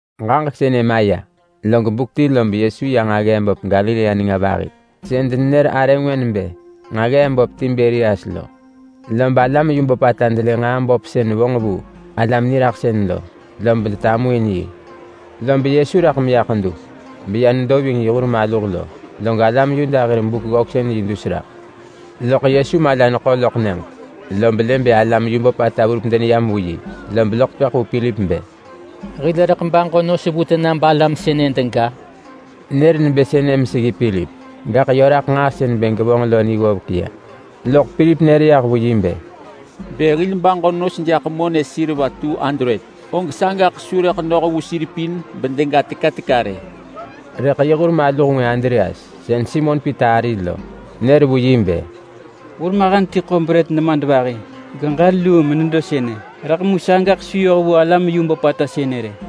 Ġaġek sënë maya, log buk ti lob Yesu ya nġaggee böp Galilea nenga vahi-sën denenër arë ngwë nebë Nġaggee-böp Tiberias lo. Lob alam yu böpata delë nġaa böp sën vonġ vu alam niraḳsën lo, lob denetamuin yi. Lob Yesu raḳ meya ḳedu beya nedo ving yi hur maluh lo, log alam Yuda hir Buk-ggöksën-yi dus raḳ. Loḳ Yesu mala neḳo loḳ nyëġ, lob lë bë alam yu böpata verup deneyam vu yi, lob loḳ tepëḳ vu Pilip bë, “Hil rëḳ baġo nos vu tena balam sënë dega?” Nër nebë sënë meseggi Pilip, gaḳ yö raḳ nġaa sën bë gevonġ lo ni ggovek ya. Loḳ Pilip nër yah vu yi bë, “Bë hil baġo nos jaḳ monë K200, og sagaḳ su rëḳ noh vu sir pin bedega teka teka rë!” Rëḳ yi hur maluh ngwë Andreas, sën Simon Pita ari lo, nër vu yi bë, “Hurmahen ti ḳo brët nemadvahi geġël luu menedo sënë. Rëḳ mu sagaḳ su yoh vu alam yu böpata sënë rë!”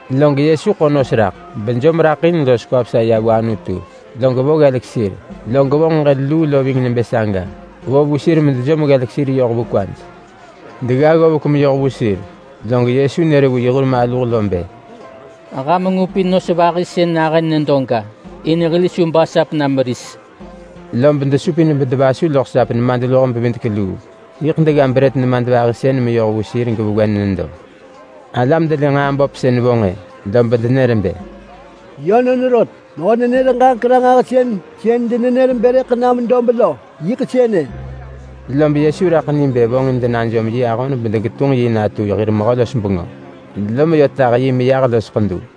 Log Yesu ḳo nos raḳ bejom raḳ in los kwa vesa ya vu Anutu, log vo ggelek sir. Log vonġ ġël luu lo ving nebë saga. Vo vu sir medejom ggelek sir yoh vu kwaj. Degga ggovek meyoh vu sir, log Yesu nër vu yi hur maluh bë, “Ham ngupin nos vahi sën nahën nedoga. In hil su basap na meris.” Lob desupin bedevasu loḳ sap nemadluho-bevidek-luu, yiḳ degga brët nemadvahi sën meyoh vu sir gevewen nedo. Alam delë nġaa böp sën vonġ-ë, lob denër bë, “Yönon rot, mehö-nenër-ġaġek-ranġahsën sën denenër bë rëḳ nam dob lo yiḳ sënë.” Lob Yesu raḳ ni bë vonġin denajom yi ahon bedegetunġ yi natu hir mehö-los-bengö, lom yö ti tah yi meyah los ḳedu.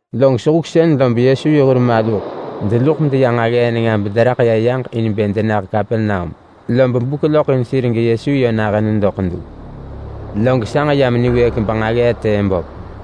Log sehuksën lob Yesu yi hur maluh deluḳ medeya nġaggee nenga bederaḳ ya yaġ in bë denah Kapernaum. Lob buk loḳ in sir geYesu yö nahën nedo ḳedu, log sanġ yam niwëëk benġaggee tëë böp.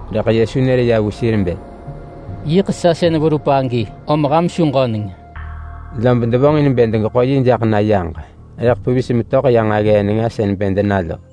Rëḳ Yesu nër ya vu sir bë, “Yiḳ sa sën verup agi, om ham su ġöneng!” Lob devonġin bë degeḳo yi jaḳ na yaġ rëḳ pevis metöḳ ya nġaggee nenga sën bë dena lo.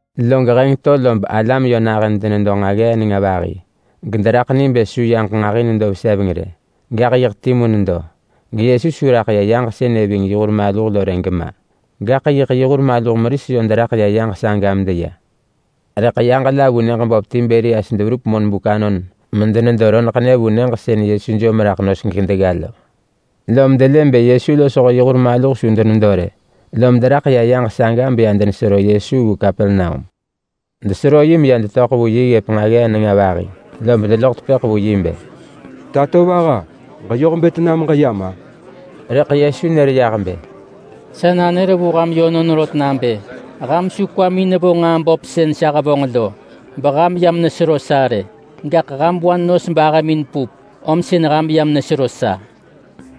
Log heng to lob alam yö nahën denedo nġaggee nenga vahi, gederaḳ ni bë su yaġ nġahi nedo veseveng rë. Gaḳ yiḳ timu nedo, geYesu su raḳ ya yaġ sënë ving yi hur maluh rë gema. Gaḳ yi hur maluh meris yö deraḳ ya yaġ saga medeya. Rëḳ yaġ la vu nyëġ böp Tiberias deverup monbuk anon medenedo roneḳnë vu nyëġ sën Yesu jom raḳ nos gedegga lo. Lom delë bë Yesu losho yi hur maluh su denedo rë, lom deraḳ ya yaġ saga beya desero Yesu vu Kapernaum. Desero yi meya detöḳ vu yi ggëp nġaggee nenga vahi, lob deloḳ tepëḳ vu yi bë, “Tatovaha! Ġeyoh bë tena meġeyam-a?” Rëḳ Yesu nër yah bë, “Sa nanër vu ham yönon rot nabë: Ham su kwamin nevo nġaa böp sën sa hevonġ lo beham yam nesero sa rë, gaḳ ham wa nos bahëmin pup, om sën ham yam nesero sa.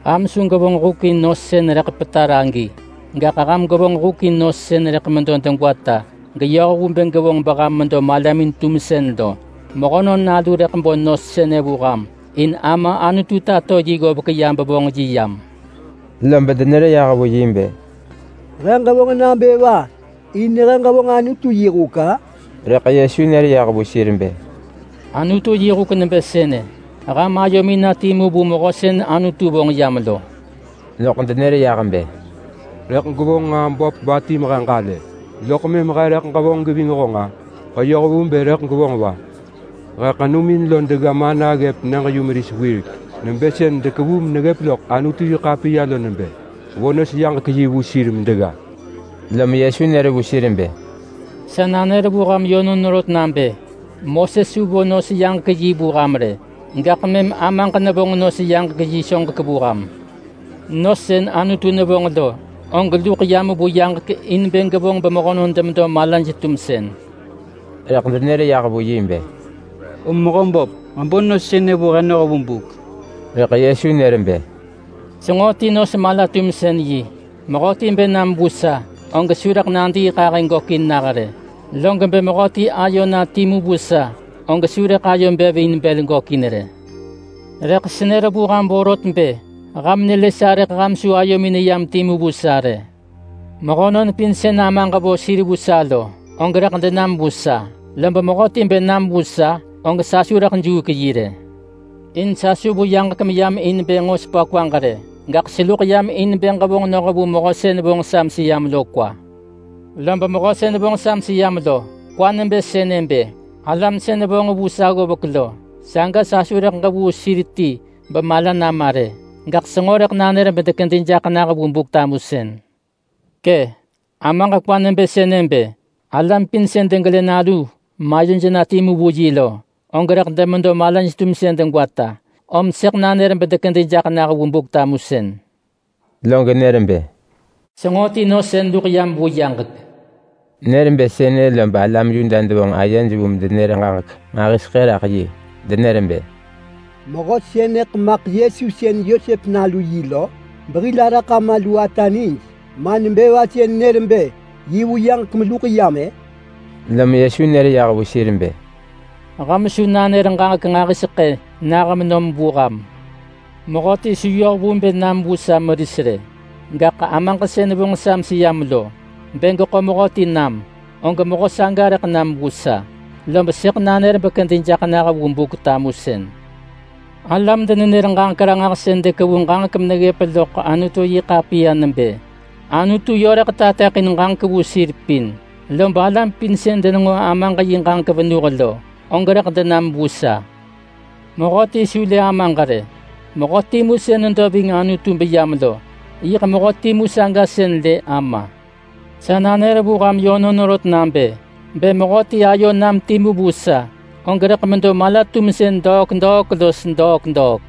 Ham su gwevonġ huk in nos sën rëḳ petar agi! Gaḳ ham gwevonġ huk in nos sën rëḳ medo degwata geyoh vu bë gevonġ beham medo malamin-tumsën lo. Mehönon Nalu rëḳ bo nos sënë vu ham, in Ama Anutu tato yi ggovek ya bevonġ yi yam.” Lob denër yah vu yi bë, “He ġevonġ nabë va in he ġevonġ Anutu yi huk-a?” Rëḳ Yesu nër yah vu sir bë, “Anutu yi huk nebë sënë: Ham ayomin na timu vu Mehö sën Anutu vonġ yam lo.” Loḳ denër yah bë, “Rëḳ gwevonġ nġaa böp va ti mehe ġalë loḳ mëm he rëḳ ġevonġ geving honġ-a? Ġeyoh vu bë rëḳ gwevonġ va? He ḳenumin lo degga mana ggëp nyëġ-yumeris wirek, nebë sën dekevu meneggëp loḳ Anutu-yi-ḳapiya lo nebë: Vo nos-yaġek-yi vu sir medegga.” Lom Yesu nër vu sir bë, “Sa nanër vu ham yönon rot nabë: Moses su vo nos-yaġek-yi vu ham rë, gaḳ mëm Amaġ nevonġ nos-yaġek-yi soġek vu ham. Nos sën Anutu nevonġ lo, og luḳ yam vu yaġek in bë gevonġ bemehönon demedo malaj-tumsën.” Rëḳ denër yah vu yi bë, “Om Mehöböp, ġebo nos sënë vu he noh vu buk!” Rëḳ Yesu nër bë, “Senġo ti nos-mala-tumsën-yi. Mehöti bë nam vu sa, og su rëḳ nadiiḳahë gökin nah rë. Log bë mehöti ayo na timu vu sa, og su rëḳ ayo bev in bël gökin rë. Rëḳ senër vu ham vorot bë ham nelë sa rëḳ ham su ayomin neyam timu vu sa rë. Mehönon pin sën Amaġ vo sir vu sa lo, og rëḳ denam vu sa. Lob mehöti bë nam vu sa, og sa su rëḳ juuk yi rë. In sa su vu yaġek meyam in bë nġo sepa kwaġ rë. Gaḳ seluḳ yam in bë ġevonġ noh vu Mehö sën vonġ sa meseyam lo kwa. Lob Mehö sën vonġ sa meseyam lo kwa nebë sënë bë: Alam sën vonġ vu sa ggovek lo, saga sa su rëḳ ġevuu sir ti bemala nama rë, gaḳ senġo rëḳ nanër bedekedi jaḳ nah vu Buk-tamusën. Kë! Amaġ kwa nebë sënë bë: Alam pin sën degelë Nalu mayoj na timu vu yi lo, og rëḳ demedo malaj-tumsën degwata. Gesëḳ nanër bedekedi jaḳ nah vu Buk-tamusën.” Log nër bë, “Senġo ti nos sën luḳ yam vu yaġek!” Nër bë sënë lob alam Yuda devonġ ayej vu medenër ġaġek nġahiseḳë raḳ yi. Denër bë, “Mehö sënëḳ maḳ Yesu sën Yosep nalu yi lo? Behil araḳ ama lu ata nij. Ma nebë va sën nër bë yi vu yaġek meluḳ yam-ë?” Lom Yesu nër yah vu sir bë, “Ham su nanër ġaġek nġahiseḳë vu ham! Mehöti su yoh vu bë nam vu sa meris rë. Gaḳ Amaġ sën vonġ sa meseyam lo, bë geḳo mehöti nam, og mehö saga rëḳ nam vu sa. Lob sëḳ nanër bekedi jaḳ nah vu Buk-tamusën. Alam-denenër-ġaġek-ranġahsën dekevu ġaġek meneggëp loḳ Anutu-yi-ḳapiya nebë: Anutu yö rëḳ tateḳin ġaġek vu sir pin. Lob alam pin sën denenġo Amaġ yi ġaġek venuh lo, og rëḳ denam vu sa. Mehöti su lë Amaġ rë. Mehö timu sën nedo ving Anutu beyam lo, yiḳ mehö timu saga sën lë Ama. Sa nanër vu ham yönon rot nabë: Bë mehöti ayo nam timu vu sa, og rëḳ medo mala-tumsën degwata los degwata.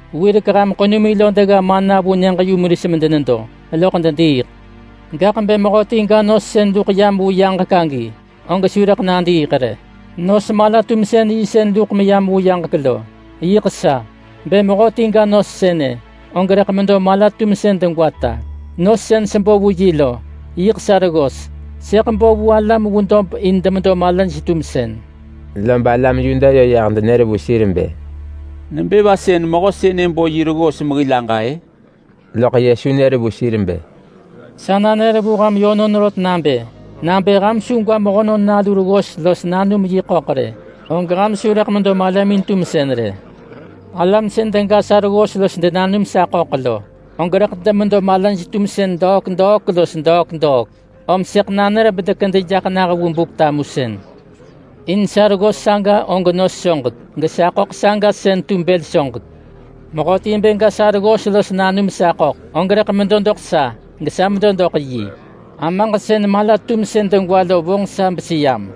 Wirek ham ḳenumin lo degga mana vu nyëġ-yumeris medenedo, loḳ dediiḳ. Gaḳ bë mehöti ga nos sën luḳ yam vu yaġek agi, og su rëḳ nadiiḳ rë. Nos-mala-tumsën-yi sën luḳ meyam vu yaġek lo, yiḳ sa. Bë mehöti ga nos sënë, og rëḳ medo mala-tumsën degwata. Nos sën sebo vu yi lo, yiḳ sa reggos. Sëḳ bo vu alam vu dob in demedo malaj-tumsën.” Lob alam Yuda yö yah denër vu sir bë, “Nebë va sën mehö sënë bo yi reggos mehil aġa-ë?” Loḳ Yesu nër vu sir bë, “Sa nanër vu ham yönon rot nabë: Nabë ham su gwa Mehönon Nalu reggos los nanum yi ḳöḳ rë, og ham su rëḳ medo malamin-tumsën rë. Alam sën dega sa reggos los denanum sa ḳöḳ lo, og rëḳ demedo malaj-tumsën degwata los degwata, om sëḳ nanër bedekedi jaḳ nah vu Buk-tamusën. In sa reggos saga og nos soġek, gesa ḳöḳ saga sën tu bël soġek. Mehöti bë ga sa reggos los nanum sa ḳöḳ, og rëḳ medo doḳ sa, gesa medo doḳ yi. Amaġ sën mala-tumsën degwa lo vonġ sa beseyam,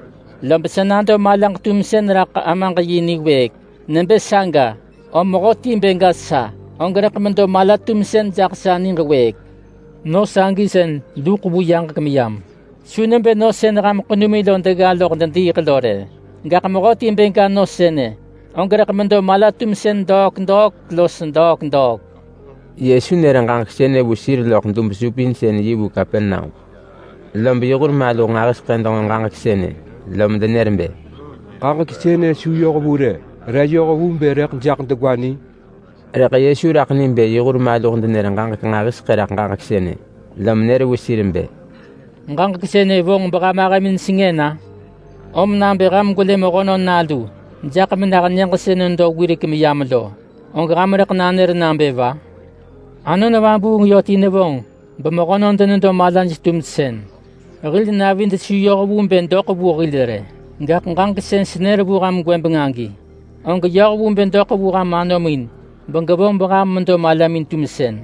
lob sa nado malaġ-tumsën raḳ Amaġ yi niwëëk. Nebë saga, om mehöti bë ga sa, og rëḳ medo mala-tumsën jaḳ sa niġ wëëk. Nos sagi sën luḳ vu yaġek meyam. Su nebë nos sën ham ḳenumin lo degga loḳ dediiḳ lo rë. Gaḳ mehöti bë ga nos sënë, og rëḳ medo mala-tumsën degwata los degwata.” Yesu nër ġaġek sënë vu sir loḳ dub-supinsën-yi vu Kapernaum. Lob yi hur maluh nġahiseḳë denġo ġaġek sënë, lom denër bë, “Ġaġek sënë su yoh vu rë! Re yoh vu bë rëḳ jaḳ degwa ni?” Rëḳ Yesu raḳ ni bë yi hur maluh denër ġaġek nġahiseḳë raḳ ġaġek sënë, lom nër vu sir bë, “Ġaġek sënë vonġ beham ahëmin sengën-a? Om nabë ham gwelë Mehönon Nalu jaḳ menah nyëġ sën nedo wirek meyam lo, og ham rëḳ nanër nabë va? Anon Vabuung yö ti nevonġ bemehönon denedo malaj-tumsën. Hil navid su yoh vu bë doḳ vu hil rë, gaḳ ġaġek sën senër vu ham gwëbeng agi, og yoh vu bë doḳ vu ham anomin begevonġ beham medo malamin-tumsën.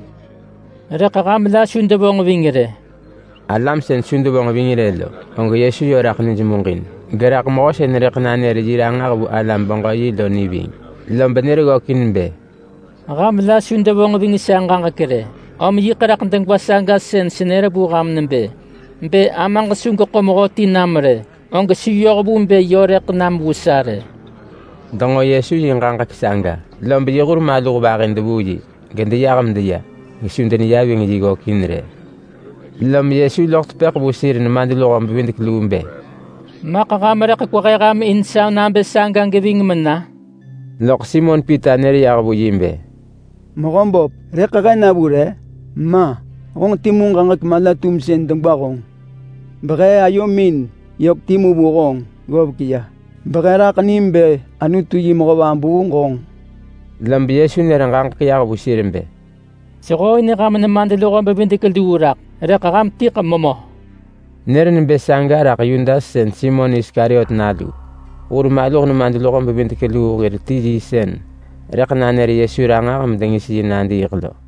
Rëḳ ham la su devonġ ving rë.” Alam sën su devonġ ving rë lo, og Yesu yö raḳ nij muġin. Geraḳ mehö sën rëḳ nanër yi ranġah vu alam-beġö-yi lo ni ving. Lob nër ggökin bë, “Ham la su devonġ ving sa ġaġek rë, om yiḳ raḳ degwa saga sën senër vu ham nebë: Bë Amaġ su geḳo mehöti nam rë, og su yoh vu bë yö rëḳ nam vu sa rë.” Denġo Yesu yi ġaġek saga, lob yi hur maluh vahi devuu yi gedeyah medeya, gesu deneya ving yi ggökin rë. Lom Yesu loḳ tepëḳ vu sir nemadluho-bevidek-luu bë, “Maḳ ham rëḳ kwehe ham in sa nabë saga geving mena?” Loḳ Simon Pita nër yah vu yi bë, “Mehöböp, rëḳ he na vu re? Ma. Honġ timu ġaġek mala-tumsën degwa honġ! Behe ayomin yök timu vu honġ ggovek ya, behe raḳ nim bë Anutu yi Mehö Vabuung honġ!” Lob Yesu nër ġaġek yah vu sir bë, “Sehooin ham nemadluho-bevidek-luu raḳ, rëḳ ham tiḳ memö!” Nër nebë saga raḳ Yudas sën Simon Iskariot nalu. Hur maluh nemadluho-bevidek-luu hir ti yi sën rëḳ nanër Yesu ranġah medengis yi nadiiḳ lo.